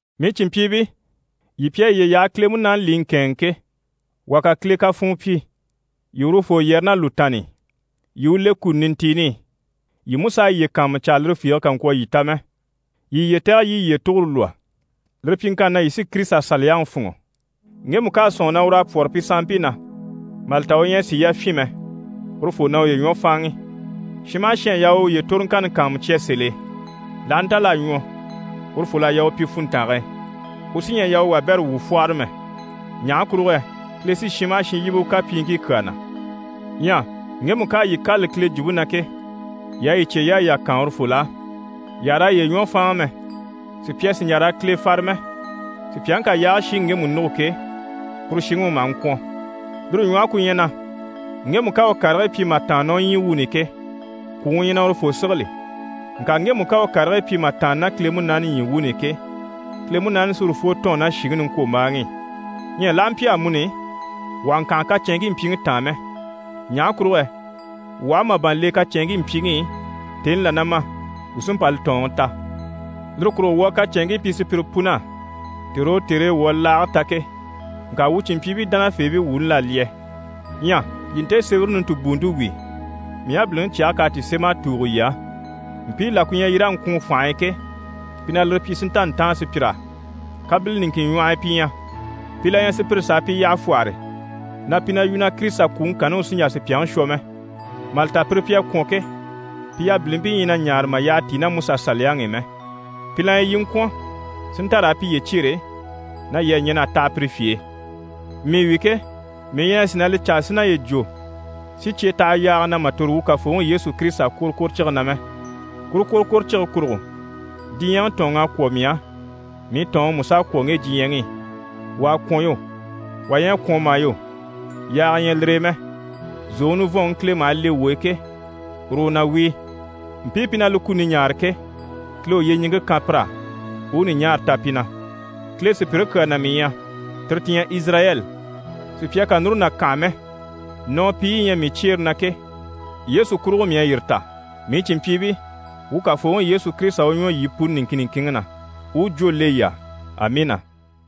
Mii cìnmpyiibii, yii pi à yiye yaha Kile Munaani li i ŋkɛ̂ɛnŋi ke, wà ká Kile kafuun pyi, yii urufoo yɛrɛ ná lùtaanni i, yii i u le kuni nintiini i. Yii mú s'a yiye kàanmucaa lire fiige kà ŋkwɔ̀ yii ta mɛ. Yii yiye tɛ̀gɛ yii i yiye tugure lwɔ́, lire pyiŋkanni na, yii sí KirisitaSaliyaŋi fûnŋɔ. Ŋgemu ká a sɔ̂nŋi na ur'à pwɔ́rɔ pi sanmpii na, mà li ta u ɲyɛ a sìi yafyin mɛ, urufoo na uye ɲwɔ fáanŋi. Shin maha shin à yaa u uye toroŋkanni kàanmucya sèl'e. L'aha nta l'à ɲwɔ, urufol'à yaa u pyi funntange e, u sí ɲyɛ a yaa u wabɛrɛ wuu fwɔ́hɔrɔ mɛ. Ɲaha kurugo yɛ Kile sí shin maha shin yíbe u kapyiiŋkii kyaa na. Ɲyɛ ŋgemu ká a yii kâlali Kile jwumpe na ke, yii a yii cyeyaayi yà kaan urufol'á. Yii àha raa yiye ɲwɔ fáanŋa mɛ, sùpya sì n‑jà raa Kile fare mɛ. Sùpyaŋi ká yaage shiŋi ŋgemu nûgo ke, kuru shiŋi u maha ŋkwɔ̀n. Lire ɲwɔhe ku ɲyɛ na ŋgemu ká a u karigii pyi mà tàanna ná u ɲyii wuuni i ke, kwùŋi u ɲyɛ na urufoo sigili. Ŋka ŋgemu ká a u karigii pyi mà tàanna ná Kile Munaani ɲyii wuuni i ke, Kile Munaani sí urufoo tɔ̂ɔn ná shìŋi niŋkwombaaŋi i. Ɲyɛ l'aha mpyi amuni, wuu àha ŋkànha kacɛnŋkii mpyiŋi taan mɛ, ɲaha kurugo yɛ wuu aha màban le kacɛnŋkii mpyiŋi i, tèni là na ma, wuu sí n‑pa li tɔ̀ɔnŋi ta. Lire kurugo wuu a kacɛnŋkii pyi sùpyire pun'á tère o tère e wuu à li laage ta ke. Ŋka wuu cìnmpyiibii dánafeebii wuuni l'à lyɛ. Ɲyɛ yii nte sémɛre nintibuunte wíi, mii yabiliŋi cyɛge k'à ti sém'a tùugo yii á. Mpii la ku ɲyɛ yii raa ŋkwùun fànhe e ke, pi na lire pyi si nta ntáan sùpyir'á. Kabile niŋkin ɲwɔh'i pi ɲyɛ, pi la ɲyɛ sùpyire s'a pi yyaha fwɔ́hɔre na pi na yu na Kirisita kwùŋi kanni u sí n‑jà sùpyaŋi shwɔ mɛ. Mà li ta, pire pi à kwɔ̀n ke, pi yabilimpii ɲyɛ na ɲaare mà yyaha tíi ná MusaSaliyaŋi i mɛ. Pi la ɲyɛ yii i ŋkwɔ̀n si nta raa piye cyêre na yii à ɲɛn'a taha pire fye e. Mii wi ke, mii ɲyɛ a sìi na li caa si naye jwo si cye taha yaaga na mà tòro wuu Kafooŋi Yesu Kirisita kworokworocige na mɛ. Kuru kworokworocige kurugo diɲyɛŋi tɔ̀ɔnŋ'à kwɔ̀ mii á, mii tɔ̀ɔnŋi mú s'à kwɔ̀ ŋge diɲyɛŋi i. Wà à kwɔ̀n yo, wà ɲyɛ a kwɔ̀n mà yo, yaaga ɲyɛ lire e mɛ, zòŋi nivɔnŋi Kile maha le wuu e ke, uru u na wíi. Mpii pi na li kuni ɲaare ke, Kile u yyeɲiŋke kan pir'á, u u ɲùɲaara ta pi na. Kile sùpyire kyaa na mii ɲyɛ, tire ti ɲyɛ Izirayɛli. Sùpya kà núru na kànha mɛ, nɔɔpiiyi yi ɲyɛ mii cyeere na ke, Yesu kurugo mii à yire ta. Mii cìnmpyiibii, wuu Kafooŋi Yesu Kirisita u ɲwɔ yii puni niŋkin niŋkinŋi na u u jwó le yii á. Amiina!